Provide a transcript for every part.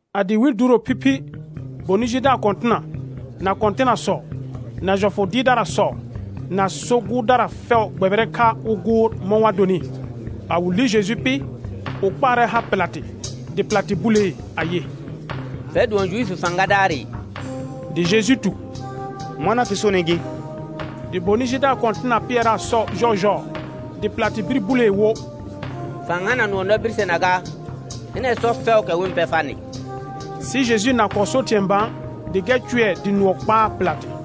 A dɩɩ wɩl duuro phiphi, bonɩ jidaar kɔ̃tɩna, na kɔ̃tɩnasɔ, na jɔfʋ dɩɩrdarasɔ, na so gʋʋrdara fɛʋ gbɛbɩrɛ kha wɩ gʋʋr mɔ̃ wa donɩ. A wɩ li Jeju pɩ, wɩ kpaarɛ ha Pɩlatɩ. Dɩ Pɩlatɩ bulee ayɩ: Fɛr dʋɔn Juifi fãgadaarɩ? Dɩ Jeju tu: Mɔna fɩ sonɩ gɩ. Dɩ bonɩ jidaar kɔ̃tɩna pɩɛraa sɔ jɔɔjɔɔ. Dɩ Pɩlatɩ bir bulee wo: Fa-n hana nʋɔ na birsena gaa? Hɩnɛ sɔ fɛʋʋkɛ wɩ-n pɛ farnɩ. Sɩ Jeju na kɔɔ so thɩ̃ɛ bã, dɩ gɛr cʋɛ dɩ nʋɔ kpaa Pɩlatɩ.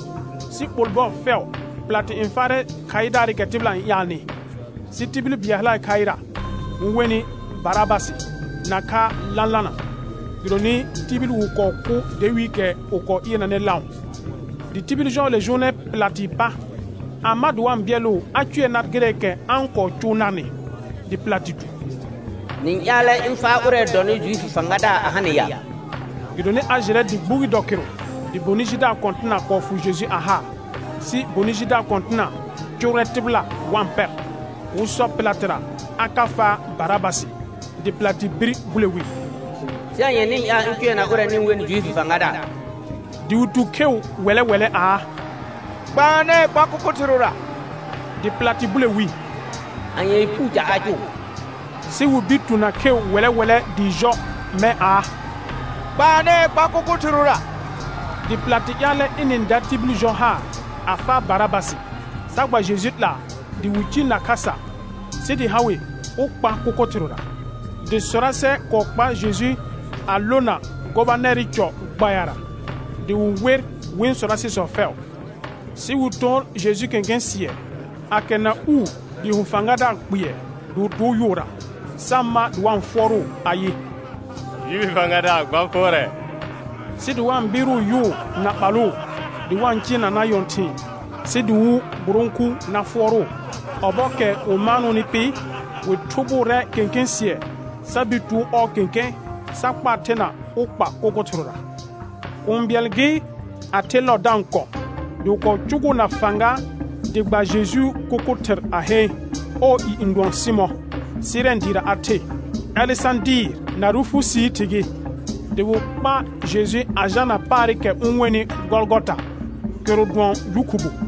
Sɩ ɓol bɔɔ fɛʋ Pɩlatɩ n faarɛ khaɩdaarɩkɛ tɩbɩla n ƴaalnɩ. Sɩ tibil bɩɛl hale khaɩra wɩ-n wenɩ Barabasɩ nakha lãlana, gɩdonɩ tibil wɩ kɔɔ kʋ dawiikɛ wɩ kɔɔ ɩɩrnanɩ lãʋ. Dɩ tibil jɔɔle jʋʋnɛ Pɩlatɩɩ pa, a ma dɩ wa-n bɩɛlʋʋ a cʋɛ nar gɩrɛɛkɛ a-n kɔɔ cʋʋ narnɩ. Dɩ Pɩlatɩ tu: Nɩ-n ƴaalɛ ɩ̃ faa ʋrɛ dɔnɩ Juifi fãgadaar a ha nɩ ya? Gɩdonɩ a jɩrɛ dɩ gbugi dɔ kɩrʋ dɩ bonɩ jidaar kɔ̃tɩna kɔɔ fʋ Jeju a haa. Sɩ bonɩ jidaar kɔ̃tɩna cʋrrɛ tɩbɩla wa-n pɛr, wɩ sɔ Pɩlatɩra a ka faa Barabasɩ. Dɩ Pɩlatɩ bir bule wi: Sɩ anye nɩ-n ƴaal ɩ̃ cʋɛna ʋrɛ nɩ-n wenɩ Juifr fãgadaar? Dɩ wɩ tu kheu wɛlɛ wɛlɛ aa: Gbaanɛɛ kpa kʋkʋ thɩrʋra. Dɩ Pɩlatɩ bule wi: Anyee puu ca a cʋʋ? Sɩ wɩ bir tu na kheu wɛlɛ wɛlɛ dɩɩ jɔ mɛ̃ aa: Gbaanɛɛ kpa kʋkʋ thɩrʋra. Dɩ Pɩlatɩ ƴaalɛ ɩnɩ-n da tibil jɔ haar a faa Barabasɩ, sa gba Jeju 'laa dɩ wɩ ciil na khasa sɩ dɩ ha wɩ wɩ kpa kʋkʋ thɩrʋra. Dɩ sɔrasɛ kɔɔ kpar Jeju a lona gobanɛrɩ cɔ gbayara, dɩ wɩ wer wɩ̃ sɔrasɩsɔ fɛʋ. Sɩ wɩ tor Jeju kẽkẽ sɩɛ, a kɛrna uu dɩɩ ho fãgadaar kpɩɛr, dɩ wɩ tʋʋ yʋʋra, sa ma dɩ wa-n fʋɔrʋʋ ayɩ: Juifi fãgadaar gba fʋɔrɛ. Sɩ dɩ wa-n bɩɩrʋʋ yʋʋ na ɓalʋʋ dɩ wa-n cɩɩrnanaa nyɔ̃thɩ̃ɩ, sɩ dɩ wɩ gburõku na fʋɔrʋʋ. Ɔbɔɔkɛ wɩ kɔɔ maanʋʋnɩ pɩ, wɩ thʋbʋʋrɛ kẽkẽ sɩɛ sa bir tʋʋ ɔɔ kẽkẽ sa kpaa thena wɩ kpa kʋkʋ thɩrʋra. Kũu bɩɛl gɩ, a the lɔɔ da-n kɔ̃, dɩ wɩ kɔɔ cʋgʋʋ na fãga dɩ gba Jejuu kʋkʋ thɩr a heen; ɔɔ i n dʋɔn Sɩmɔ̃, Sɩrɛn dɩɩra a the, Alesãdɩɩr na Rufusii thɩ gɩ. Dɩ wɩ kpa Jeju a jalna paarɩkɛ wɩ-n wenɩ Gɔlgɔta, kɩrʋ dʋɔn Yʋ khubu.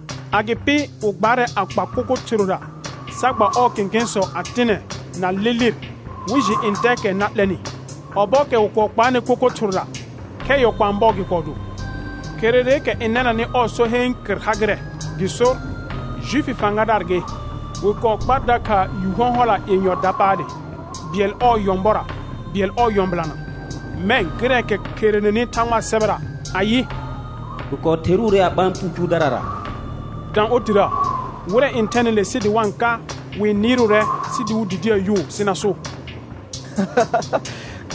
Agɩpɩ wɩ gbaarɛ a kpa kʋkʋ thɩrʋra, sa gba ɔɔ kẽkẽsɔ a tɩnɛ na lɩ lɩr wɩ jɩ ntɛɛkɛ na 'lɛnɩ. Ɔbɔɔkɛ wɩ kɔɔ kpaanɩ kʋkʋ thɩrʋra, khɛ yɔ kpãa bɔɔ gɩ kɔɔ do. Kherereekɛ n nɛnanɩ ɔɔ so heen kɩr ha gɩrɛ, gɩ sor: Juifi fãgadaar gɩ. Wɩ kɔɔ kpar dakha yu hɔ̃hɔla yenyɔ dapaale, bɩɛl ɔɔ nyɔ̃bɔra, bɩɛl ɔɔ nyɔ̃bɩlana. [Mɛ̃ gɩrɛɛkɛ kherenenɩ Thãgbaa sɛbɛra ayɩ: «Wɩ kɔɔ theruure a ɓã puu cʋʋdarara» dã otirə.] Wɩrɛ n thɛnɩ le sɩ wa-n ka wɩ-n nɩɩrʋʋrɛ sɩ dɩ wɩ didiə yʋʋ sɩ na so: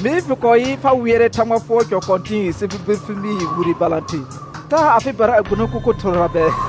Mee fɩ kɔɔ yɩ fa wɩɛrɛ Thãgba fʋɔr cɔ kɔ̃tɩ̃ɩ sɩ fɩ bir fɩ mɩ wire balãther; taa afɩbara a gbuno kʋkʋ thɩrʋra bɛɛ.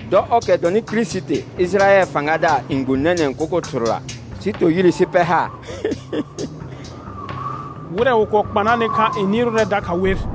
Dɔ ɔrkɛ dɔnɩ Kirisiti, Ɩjɩrayɛl fãgadaar n gbũ nɛnɛ̃ kʋkʋ thɩrʋra sɩ tor yire sɩ pɛr haar. Wɩrɛ wɩ kɔɔ kpanaanɩ kha n nɩɩrʋʋrɛ dakha wer.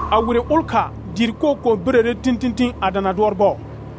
A wire ʋlkha dɩɩ koo kɔɔ birəre tĩtĩtĩ a dana dʋɔr bɔɔ.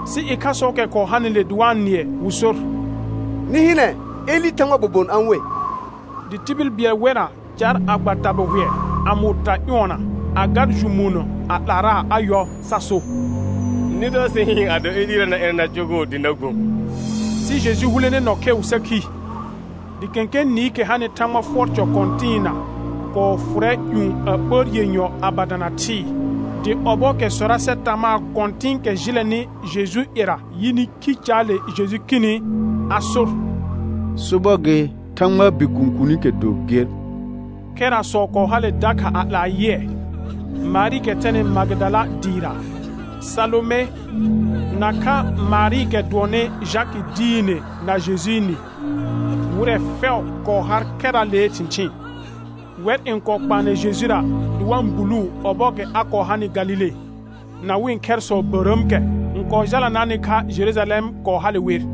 Sɩ ɩkhasɔɔkɛ kɔɔ hanɩle dɩ wa-n nɩɛ, wɩ sor: Nɩ hɩnɛ, Elɩ Thãgbaa bobon a-n we. Dɩ tibil bɩɛl wɛrra car a gba tabɩhʋɛ a mʋʋ ta ƴʋɔna, a gar jʋmuunə a 'laaraa a yɔ, sa so: Nɩ dɔ sɩ hɩɩn ado Elɩra na ɩnɛ na cʋgʋʋ dɩ na gbũ. Sɩ Jeju hulene nɔ kheu sa khi. Dɩ kẽkẽ nɩɩkɛ hanɩ Thãgba fʋɔr cɔ kɔ̃tɩɩna kɔɔ fʋrɛ ƴũ a ɓəər yenyɔ a ba dana thɩɩ. Dɩ ɔbɔɔkɛ sɔrasɛ tamaa kɔ̃tɩ̃ɩkɛ jɩlɛnɩ Jejuu ƴɛra yɩnɩ khi caale Jeju khini, a sor: Sobɔr gɩ, Thãgbaa Bikuun kuunikɛ do ger. Khɛrasɔ kɔɔ hale dakha a 'laa yɩɛ; Marɩɩkɛ thɛnɩ Magɩdala dɩɩra, Salome, nakha Marɩɩkɛ dʋɔnnɩ Jakɩ diine na Jojɩɩ nɩ, wɩrɛ fɛʋ kɔɔ har khɛraalee thɩ̃thɩɩn. Wɛr n kɔɔ kpaanɛ Jejura dɩ wa-n buluu ɔbɔɔkɛ a kɔɔ hanɩ Galile, na wɩ̃ khɛrsɔ bərəəmkɛ n kɔɔ jalanaanɩ kha Jerujalɛm kɔɔ hale wer.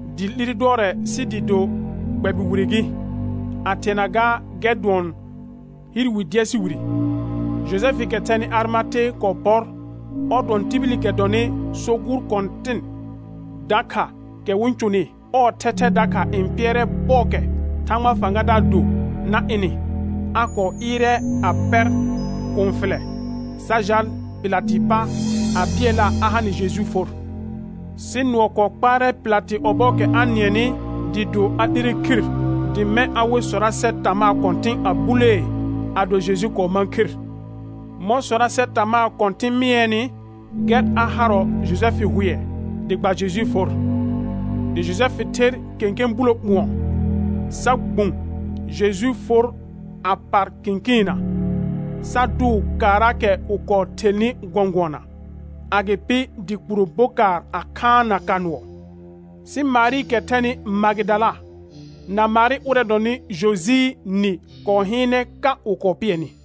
Dɩɩ 'lire dʋɔrɛ sɩ dɩɩ do gbɛbɩ wire gɩ, a thɩɛna gaa gɛr dʋɔn hɩɩr wi dɛɛsɩ wire. Jojɛfɩɩkɛ thɛnɩ Arɩmate kɔɔ pɔr, ɔr dʋɔn tibilikɛ dɔnɩ so gʋʋr kɔ̃tɩn dakha kɛ wɩ-n cʋnɩ, ɔɔ thɛthɛ dakha n pɩɛrɛ bɔɔkɛ Thãgbaa fãgadaar do na ɩnɩ; a kɔɔ ɩɩrɛ a pɛr kũu fɩlɛ sa jal Pɩlatɩɩ pa a bɩɛlaa a ha nɩ Jejuu for. Sɩ nʋɔ kɔɔ kpaarɛ Pɩlatɩ ɔbɔɔkɛ a nɩɛnɩ dɩɩ do a 'lire khir, dɩ mɛ̃ a we sɔrasɛ tamaa kɔ̃tɩ̃ a bulee ado Jeju kɔɔ mãa khir. Mɔ̃ sɔrasɛ tamaa kɔ̃tɩ̃ mɩɛɛnɩ, gɛr a harɔ Jojɛfɩ hʋɛ dɩ gba Jejuu for. Dɩ Jojɛfɩ ther kẽkẽ bulo ɓʋ̃ɔ, sa gbũ Jejuu for a par kɩ̃kɩɩnna, sa dʋʋ kaaraakɛ wɩ kɔɔ thelnɩ gɔ̃gʋɔna, agɩpɩ dɩ kpuro bokaar a khaanna ka nʋɔ. Sɩ Marɩɩkɛ thɛnɩ Magɩdala na Marɩ ʋrɛ dɔnɩ Jojɩɩ nɩ kɔɔ hɩɩnɛ ka wɩ kɔɔ pɩɛnɩ.